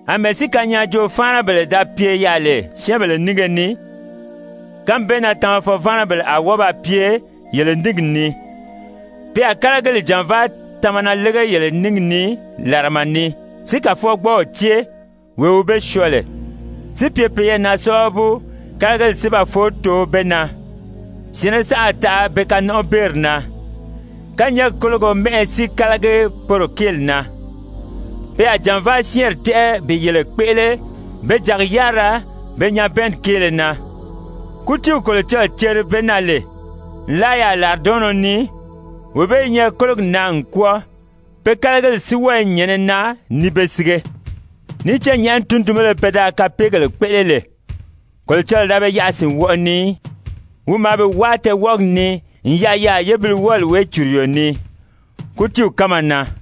Amɛɛ si kanyaajoo-fáanabèle da pye yaà lè syɛ́ɛnbèle nínge ni, kánmi bee na tamafɔ-váanabèle a wɔ́ɔ ba pye yele níngi ni. Pe a kálagili jànvaa tamana lége yele níngi ni làrama ni, si Kàfɔgbɔɔw cée, wee wi be syɔɔ lè, si pye peyɛɛ na sábabu kálagili si ba foó too be na. Syɛ̀ɛnnɛ saʔa a taʔa be kanɔnʔɔbeeri na, kányɛɛgi kólogo mɛ́ʔɛ si kálagi poro kéeli na. Pe a jànvaa syɛ́ɛnri tɛ́ʔɛ bi yele kpéʔele be jàgi-yárira be nyabɛɛnni kéele na. Kútiiw Kolocɔlɔɔ ceri be na lè nlaa yaà làridɔɔnnɔ ni, wee bee i nyɛ kólogi na n kwɔ́ɔ, pe kálagili si wɔ́ɔ i nyɛ̀nɛ na ni be sige. Níì cán nyɛ̀ʔɛni tundunbéle pe da kapeegèle kpéʔele lè, Kolocɔlɔɔ da be yaʔa sìnwɔʔɔ ni í, wi maa be wáa tɛɛwɔʔɔgi ni n yaʔa yaà yébiliwɔɔli wéecuruyo ni, kútiiw kánma na.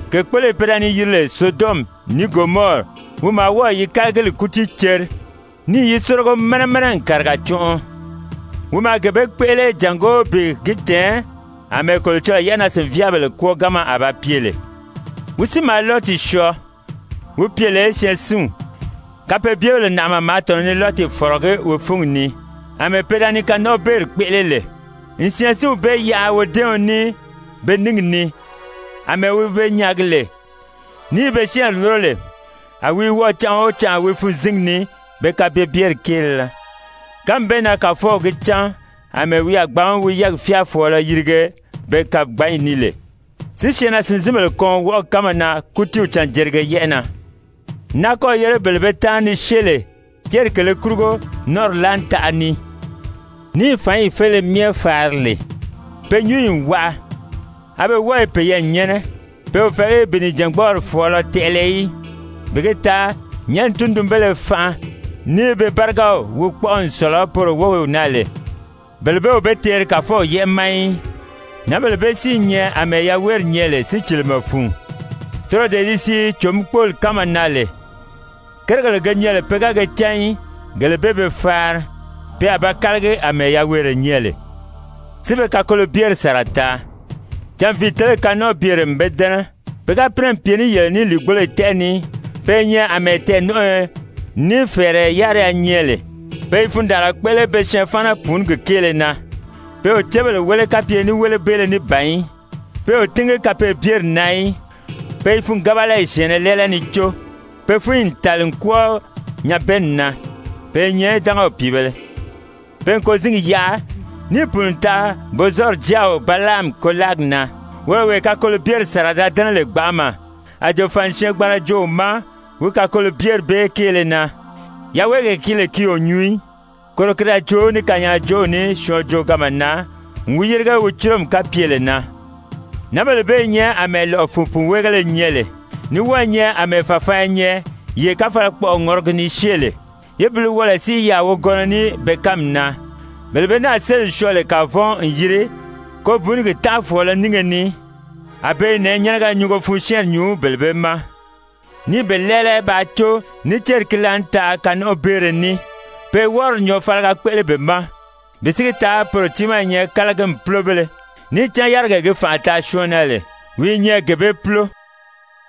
Kèkpoloyi pe da ni yiri lè Sodɔmi ní Gomɔri, wi maa wɔ́ɔ̀ yi kálagili kútii ceri, níì yi sórigo mɛnɛ mɛnɛ n kàriga cɔnʔɔ, wi maa gee bee kpéʔele jàngó bi gi tɛ̀ɛn àmɛɛ Kolocɔlɔɔ yɛ́ʔɛnaa-sìnvyaabèle kwɔ́ɔganma a ba pye lè. Wi si maa Lɔti syɔɔ, wi pye lè syɛɛnsinw, kapeebyebèle nàʔama maa tɔ̀nɔ ni Lɔti fɔ̀rɔgí wi fúngi ni, àmɛɛ pe da ni kanɔnʔɔbeeri kpéʔele lè. N syɛɛnsinw bee yaʔa wodɛ́ɛɔn ní be níngi ni, àmɛɛ wi be nyaagi lè, ní i be syɛ́ɛnri lúro lè, a wi i wɔʔɔ canʔa o canʔa wi fûnzingi ni pe kapeebyeri kéele na. Kánmi bee na Kàfɔw gi cán àmɛɛ wi a gbǎn wi yɛ́ɛgi fyáafɔɔlɔ yirige be kagbanyi ni lè, si syɛɛnnaa-sìnzinbèle kɔn wɔʔɔgi kánma na kútiiw canjerige yɛ́ʔɛ na, n náa kɔ́ɔ̀ yére bele be táanri ni syée lè céri kèlē kurugo nɔ́nʔɔri láanitaʔa ni, ní i fǎnyi féleye myɛ faari lè. Pe nyúnyi n waʔa, a be wɔ́ɔ i peyɛɛ nyɛ́nɛ, pe o fɛ̀ɛgí bi nìjangbɔɔri fɔ̀ɔlɔ tɛʔɛlɛ í, bi gi taa nyɛ̀ʔɛni tundunbéle fanʔa, ní be bárigaw wi kpɔ́ʔɔ n sɔ̀lɔ poro wów na lè, bele bee o be teeri Kàfɔw yɛ́ʔɛ ma í! Nǎnbèle bee si i nyɛ àmɛɛ yaweeri nyɛ lè sícilimɛ fun, toro dee di sii cò-mí-kpóoli kánma na lè, kérigèle ge nyɛ lè pe ga ge cán í, gele bee be faari. Pe a ba kálagi àmɛɛ yaweere nyɛ lè, si be kakolobyeri sàra taa. Canviitelegi kanɔnʔɔbyere n be dɛ́nɛ. Pe ga pínɛ n pye ní yele ní lìigboloyi tɛ́ʔɛ ni, pe i nyɛ àmɛɛ tɛɛ̀nɔnʔɔyɔ, ní fɛ̀ɛrɛ yáriya nyɛ lè, pe i fundaanra kpéʔele be syɛɛnfaana-pùunigi kéele na, pe o cébèle wéle kapye ní wélebeele ní ban í, pe o tíngi kapeebyeri na í, pe i fûngabalayi syɛ̀ɛnnɛ lɛ́ɛlɛ ni có. Pe fúnyi n tàli n kwɔ́ɔ nyabɛɛnni na. Pe i nyɛ dángaw pìibēle. Pe n kôzingi yaʔa níì pùuni n taʔa Bozɔri jáaw Balaami kôlaagi na, woro wee kakolobyeri sàra da dɛ́nɛ lè gbanʔama, a jòfani syɛɛngbanra joo wi ma wi kakolobyeri bee kéele na, yaweegee ki lè ki o nyuu í, koro ki da joo ní kanyaajoow ní syɔɔn jooganma na n wi yérige wi cúromi kapyele na. Nǎnbèle bee i nyɛ àmɛɛ lɔ̀ʔɔ fun pùnweegéle nyɛ lè, ní wɔ́ɔ i nyɛ àmɛɛ fàfaanya nyɛ yee káfalakpɔʔɔ ŋɔrɔgi ni syée lè. Yébiliwɔɔlɔ si i yaà wogɔnnɔ ní be kánmi na. Bele be náà séli n syɔɔ lè kavɔn n yiri kobuunugi tánʔafɔɔlɔ nínge ni, a be i nɛ̀ɛnyɛnɛgɛ nyungo fun syɛ́ɛnri nyuu bele bee ma, ní i be lɛ́ɛlɛ bàā có ní céri ki laànitaʔa kanɔnʔɔbeere ní. Pe i wɔ́rɔdi nyɔɔfaliga kpéʔele be ma, bi si gi taa poro tiimaa i nyɛ kálagimi púlobéle, níì cán yárigee gi fànʔa taa syɔɔn na lè, wi i nyɛ gee bee púlo.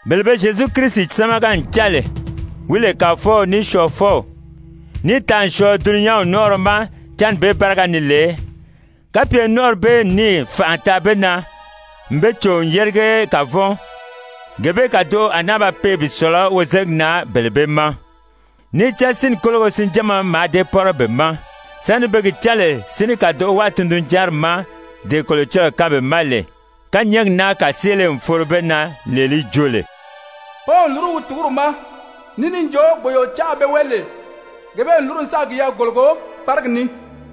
Bele be Zyezu Kirisi sámaga n cán lè, wi lè Kàfɔw ní Syɔɔfɔw, níì taa n syɔɔ dulunyanw nɔ́nʔɔrɔ ma cánni bee báriga ni lè, kapye nɔ́nʔɔri bee n níì fànʔa taa be na n be cò n yérige kavɔn, gee bee kàdoʔo a náa ba pee bi sɔ̀lɔ wozeligi na bele bee ma. Níì cán sínni kólogo sinjánma mǎà dée pɔ́rɔ be ma, sáni be gi cán lè si ní kàdoʔo wáa tundunjanri ma, dee Kolocɔlɔɔ kaan be ma lè. Kányɛɛgi naa kàseele n foro be na, lee li jo lè: «Pɔ́nw n lúru wi tùguri ma,» ní níì jo: «Gbòyoocaʔa pe wéli lè, gee bee n lúru n sáà kiyɛɛ kòlogo fárigi ni.»